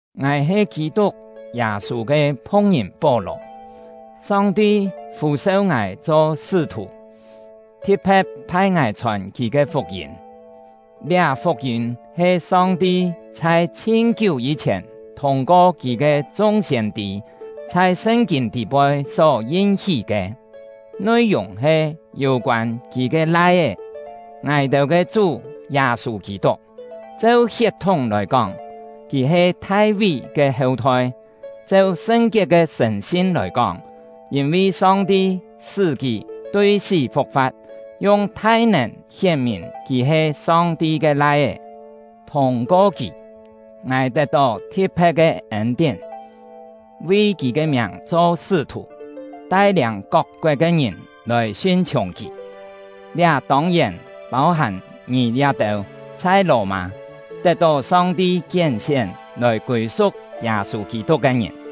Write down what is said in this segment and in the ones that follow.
Ngài he Kî-tuk Yâ-sû ke phu̍k-ngìn Pó-lò; Song-ti fû-seu ngài cho sṳ́-thù, thi̍t-phe̍t phai ngài chhòn Kì ke fuk-yîm. Liá fuk-yîm he Song-ti chhai chhin-kiú yî-chhièn thûng-ko Kì ke chung siên-tî chhai Sṳn-kîn tî-poi só yin-hí ke, nui-yùng he yû-koân Kì ke Lai-é — ngài-têu ke Chú Yâ-sû Kî-tuk. Cheu hiet-thúng lòi kóng, kì he Thai-ví ke heu-thoi; cheu sṳn-kiet ke sṳ̀n-sin lòi kóng, yîn-vi Song-ti sṳ́ kì tui sí fu̍k-fa̍t, yung thai-nèn hién-mìn kì he Song-ti ke Lai-é. Thûng-ko kì, ngài tet-tó thi̍t-phe̍t ke ên-tién, vi kì ke miàng cho sṳ́-thù, tai-liâng kok-koet ke ngìn lòi sin-chhiùng kì. Liá tông-yèn pâu-hàm ngì liá-têu chhai Lò-mâ, tet-tó Song-ti kién-sién lòi kûi-su̍k Yâ-sû Kî-tuk ke ngìn.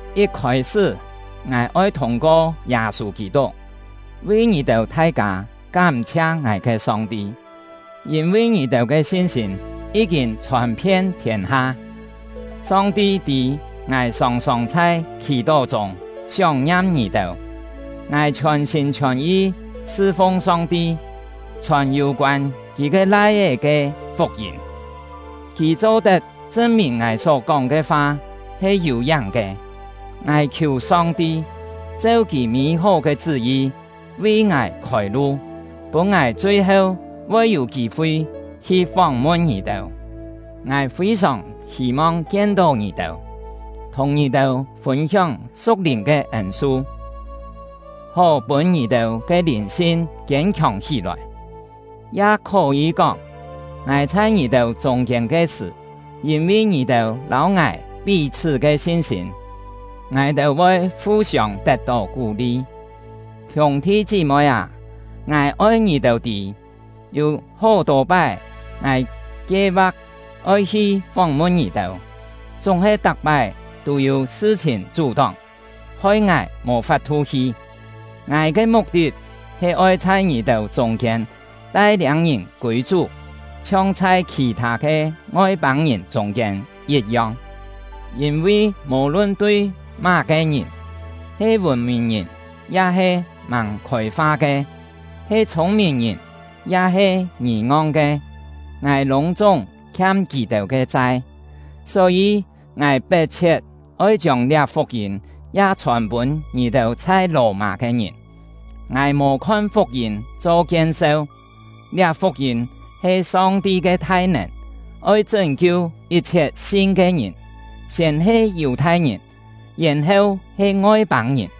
Yit khôi-sṳ́, ngài oi thûng-ko Yâ-sû Kî-tuk, vi ngì-têu thai-kâ kám-chhia ngài ke Song-ti, yîn-vi ngì-têu ke sin-sîm yí-kîn chhòn-phien thiên-ha. Song-ti tî ngài sòng-sòng chhai khì-tó chûng sióng-ngiam ngì-têu. Ngài chhiòn-sîm chhiòn-yi sṳ-fung Song-ti, chhòn yû-koân Kì ke Lai-é ke fuk-yîm; Kì cho-tet chṳn-mìn ngài só-kóng ke fa he yû-yáng ke. Ngài khiù Song-ti, cheu Kì mî-hó ke chṳ́-yi vi ngài khôi-lu, pûn ngài chui-heu voi yû kî-fi hi fóng-mun ngì-têu. Ngài fî-sòng hî-mong kien-tó ngì-têu, thùng ngì-têu fûn-hióng su̍k-lìn ke ên-su, hó pûn ngì-têu ke lìn-sin kiên-khiòng hí-lòi; ya khó-yî kóng, ngài chhai ngì-têu chûng-kiên ke sṳ̀, yîn-vi ngì-têu lâu ngài pí-chhṳ́ ke sin-sîm, ngài-têu voi fu-siông tet-tó kú-li. Hiûng-thi chí-moi â, ngài oi ngì-têu tî, yû hó-tô pái ngài kie-va̍k oi hi fóng-mun ngì-têu, chúng-he tak-pái tû yû sṳ-chhìn chú-tóng, hoi ngài mò fap-thu hi. Ngài ke muk-tit he oi chhai ngì-têu chûng-kiên tai-liâng ngìn kûi Chú, chhiong chhai khì-thâ ke Ngoi-pâng-ngìn chûng-kiên yit-yong. Yîn-vi mò-lun tui má-ke ngìn, he vùn-mìn-ngìn ya-he màng khôi-fa ke, he chhûng-mìn-ngìn ya-he ngì-ngong ke, ngài lûng-chúng khiam kì-têu ke chai. Só-yî, ngài pet-chhiet oi chiông liá fuk-yîm ya chhòn-pûn ngì-têu chhai Lò-mâ ke ngìn. Ngài mò khon fuk-yîm cho kien-seu; liá fuk-yîm he Song-ti ke thai-nèn, oi chṳ́n-kiu yit-chhiet sin ke ngìn, siên he Yù-thai-ngìn, yèn-heu he Ngoi-pâng-ngìn.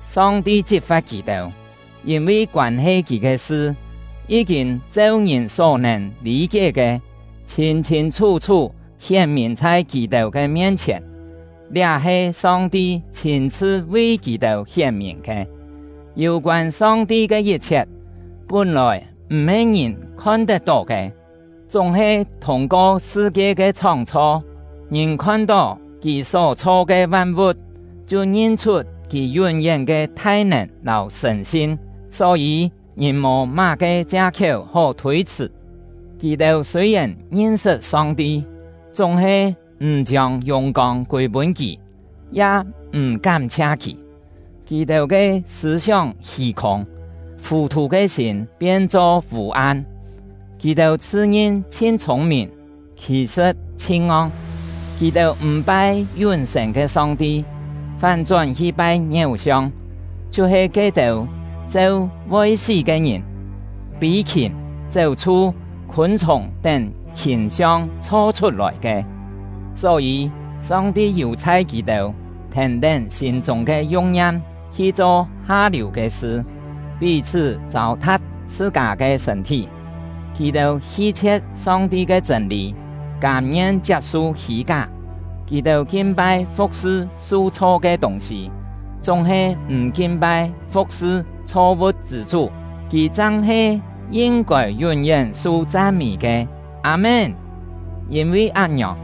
Song-ti chit-fa̍t kì-têu, yîn-vi koân-he Kì ke sṳ, yí-kîn cheu ngìn só-nèn lî-kié ke, chhîn-chhîn chhú-chhú hién-mìn chhai kì-têu ke mien-chhièn; liá he Song-ti chhîn-chhṳ vi kì-têu hién-mìn ke. Yû-koân Song-ti ke yit-chhiet, pún-lòi m̀-he ngìn khon-tet-tó ke, chúng-he thûng-ko sṳ-kie ke chhóng-chho, ngìn khon-tó Kì só chho ke van-vu̍t, chhiu ngin-chhut Kì yún-yén ke thai-nèn lâu sṳ̀n-sin. Só-yî, ngìn mò má-ke chia-khiéu hó thôi-chhṳ̀. Kì-têu sûi-yèn ngin-sṳt Song-ti, chúng-he m̀ chiông yùng-kông kûi-pûn Kì, ya m̀ kám-chhia Kì; kì-têu ke sṳ̂-sióng hî-khûng, fù-thù ke sîm pien-cho vû-am. Kì-têu chhṳ-ngin chhin chhûng-mìn, khì-sṳ̍t chhin ngong. Kì-têu m̀ pai yún-sên ke Song-ti, fán-chón hi pai ngiéu-siong, chhiu-he ke-têu cheu voi sí ke ngìn, fî-khìm, chéu-chhu, khûn-chhùng tén hìn-siong chho-chhut-lòi ke. Só-yî, Song-ti yù-chhai kì-têu thèn-tén sîm-chûng ke yu̍k-ngiam hi-cho ha-liù ke sṳ, pí-chhṳ́ châu-tha̍p chhṳ-kâ ke sṳ̂n-thí. Kì-têu hi-chhie̍t Song-ti ke chṳ̂n-lî, kâm-ngien chiap-su hî-ká: Kì-têu kin-pai fu̍k-sṳ su-chho ke tûng-sî, chúng-he m̀ kin-pai fu̍k-sṳ chho-vu̍t chṳ̂ Chú — Kì chang he yin-kôi yún-yén su chan-mî ke. Â-mén! Yîn-vi án-ngiòng,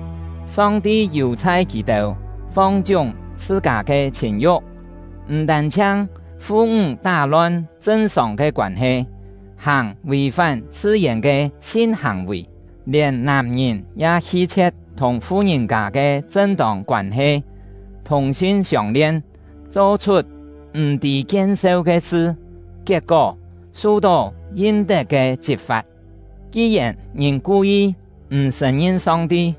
Song-ti yù-chhai kì-têu fong-chiúng chhṳ-kâ ke chhìn-yu̍k; m̀ tân-chhiang fu-ńg tá-lon chṳn-sòng ke koân-he, hàng vì-fán chhṳ-yèn ke sin-hàng-vì, lièn nàm-ngìn ya hi-chhie̍t thùng fu-ngìn-kâ ke chṳn-tông koân-he, thùng-sin siông-lien, cho-chhut m̀-tî kien-seu ke sṳ, kiet-kó, su-tó yin-tet ke chit-fa̍t. Ki-yèn ngìn ku-yi m̀ sṳ̀n-ngin Song-ti,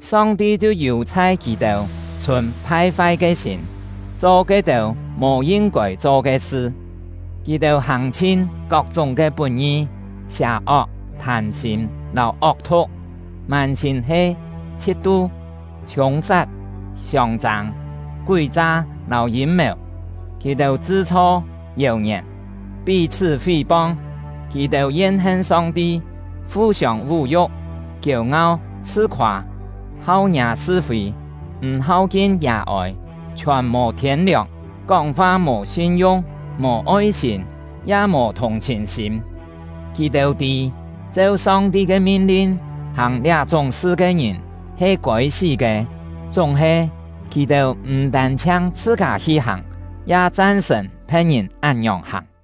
Song-ti chhiu yù-chhai kì-têu chhùn phai-fai ke sîm, cho ke-têu mò yin-kôi cho ke sṳ. Kì-têu hàng-chhin kok-chúng ke put-ngi, sià-ok, thâm-sîm lâu ok-thu̍k; mân-sîm he chhit-tu, hiûng-sat, siông-châng, kúi-cha lâu yîm-mèu. Kì-têu chṳ-chho yèu-ngièn, pí-chhṳ́ fí-pong. Kì-têu yen-hen Song-ti, fu-siông vú-yu̍k, kiêu-ngau, chhṳ-khoâ, hau ngiâ sṳ-fî, m̀ hau-kin yà-ôi, chhiòn mò thiên-liòng, kóng-fa mò sin-yung, mò oi-sîm, ya mò thùng-chhìn-sîm. Kì-têu tî, cheu Song-ti ke min-lin, hàng liá-chúng sṳ ke ngìn he kôi-sí ke; chúng-he, kì-têu m̀ tân-chhiang chhṳ-kâ hi hàng, ya chan-sṳ̀n phe̍t-ngìn án-ngiòng hàng.